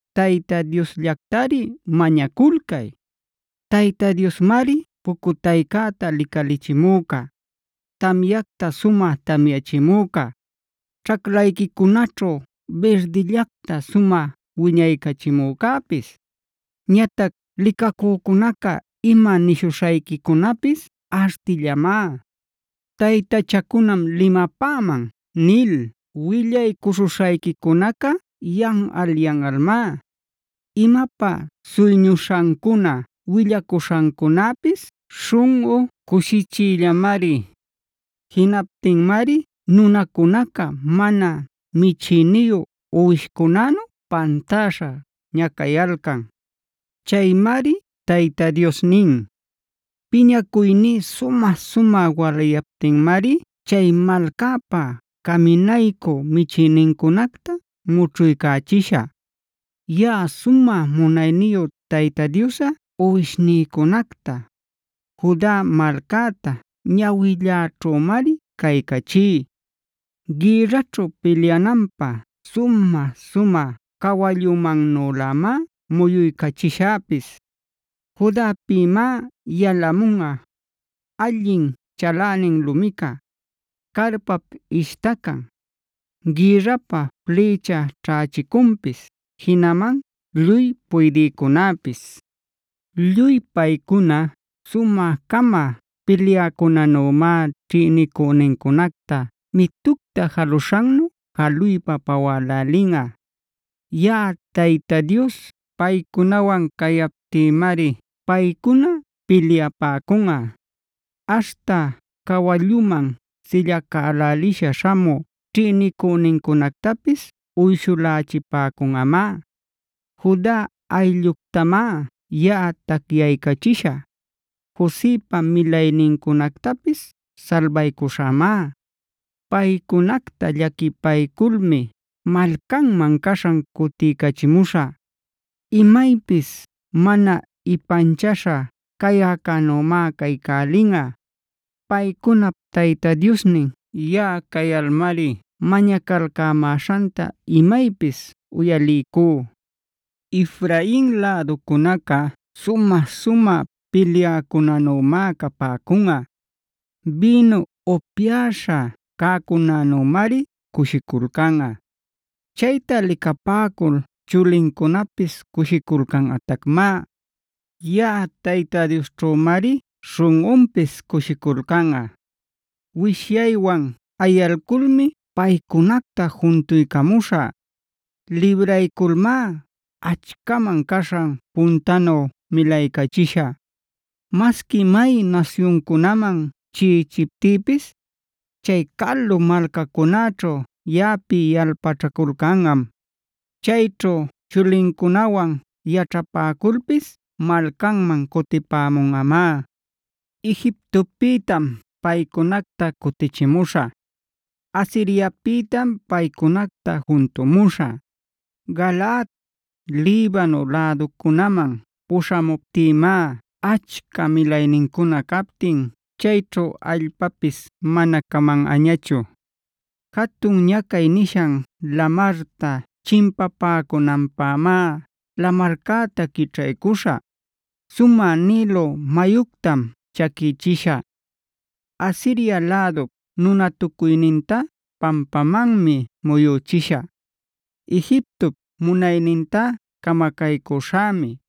Tayta Diosllactari mañaculcay. Tayta Diosmari pucutayta licalichimüca, tamyacta sumä tamyachimüca, ćhaclayquicunaćhu birdillacta sumä wiñaycachimücäpis. Ñatac licacücunaca ima nishuśhayquicunäpis artillamá; “Taytachacunam limapäman” nil willaycuśhuśhayquicunacá yanꞌal-yanꞌalmá. Imapä suyñuśhancuna willacuśhancunäpis śhunꞌu cushichiyllamari. Jinaptinmari nunacunaca mana michïniyu uwishcunänu pantäśha ñacayalcan. Chaymari Tayta Dios nin: “Piñacuyní sumä-sumä walayaptinmari chay malcäpa caminaycü michïnincunacta mućhuycachishä. Yaꞌa sumä munayniyu Tayta Diosꞌa uwishnïcunacta, Juda malcäta ñawilläćhümari caycachí. Gïrraćhu pilyananpä sumä-sumä cawallumannülämá muyuycachishäpis. Judapïmá yalamunꞌa: allin chalänin lumica, carpap ishtacan, gïrrapä flïcha ćhächicunpis, jinaman lluy puydïcunapis. Lluy paycuna sumä-cama pilyäcunanümá ćhïnicünincunacta mitucta jaluśhannu jaluypa pawälälinꞌa. Yaꞌa Tayta Dios paycunawan cayaptïmari paycuna pilyapäcunꞌa. Aśhta cawallunman sillacälälisha śhamü ćhïnicünincunactapis uyshulächipäcunꞌamá. “Juda aylluctamá yaꞌa tacyaycachishä; Josepa milaynincunactapis salbaycuśhämá. Paycunacta llaquipayculmi malcanman caśhan cutiycachimuśhä. Imaypis mana ipanchaśha cayäcänümá caycälinꞌa. Paycunap Tayta Diosnin yaꞌa cayalmari mañacalcämäśhanta imaypis uyaliycú. Efrain läducunaca sumä-sumä pilyäcunanümá capäcunꞌa; bïnu upyäśha cäcunänümari cushiculcanꞌa. Chayta licapäcul chulincunapis cushiculcanꞌatacmá; yaꞌa Tayta Diosćhümari śhunꞌunpis cushiculcanꞌa. “Wishyaywan ayalculmi paycunacta juntuycamuśhä. Librayculmá achcaman caśhan puntanu milaycachishä. Masqui may nasyuncunaman chiꞌichiptïpis, chay calu malcacunäćhu yaꞌapi yalpaćhaculcanꞌam. Chayćhu chulincunawan yaćhapäculpis malcanman cutipämunꞌamá. Egiptopïtam paycunacta cutichimuśhä; Asiriapïtam paycunacta juntumuśhä. Galaad, Libano läducunaman puśhamuptïmá achca milaynincuna captin chayćhu allpapis mana camanꞌañachu. Jatun ñacay nishan lamarta chimpapämunanpämá lamarcäta quićhaycuśhä. Sumä Nilo mayuctam chaquïchishä; Asiria lädup nunatucuynintá pampamanmi muyüchishä; Egiptop munaynintá camacaycüśhämi;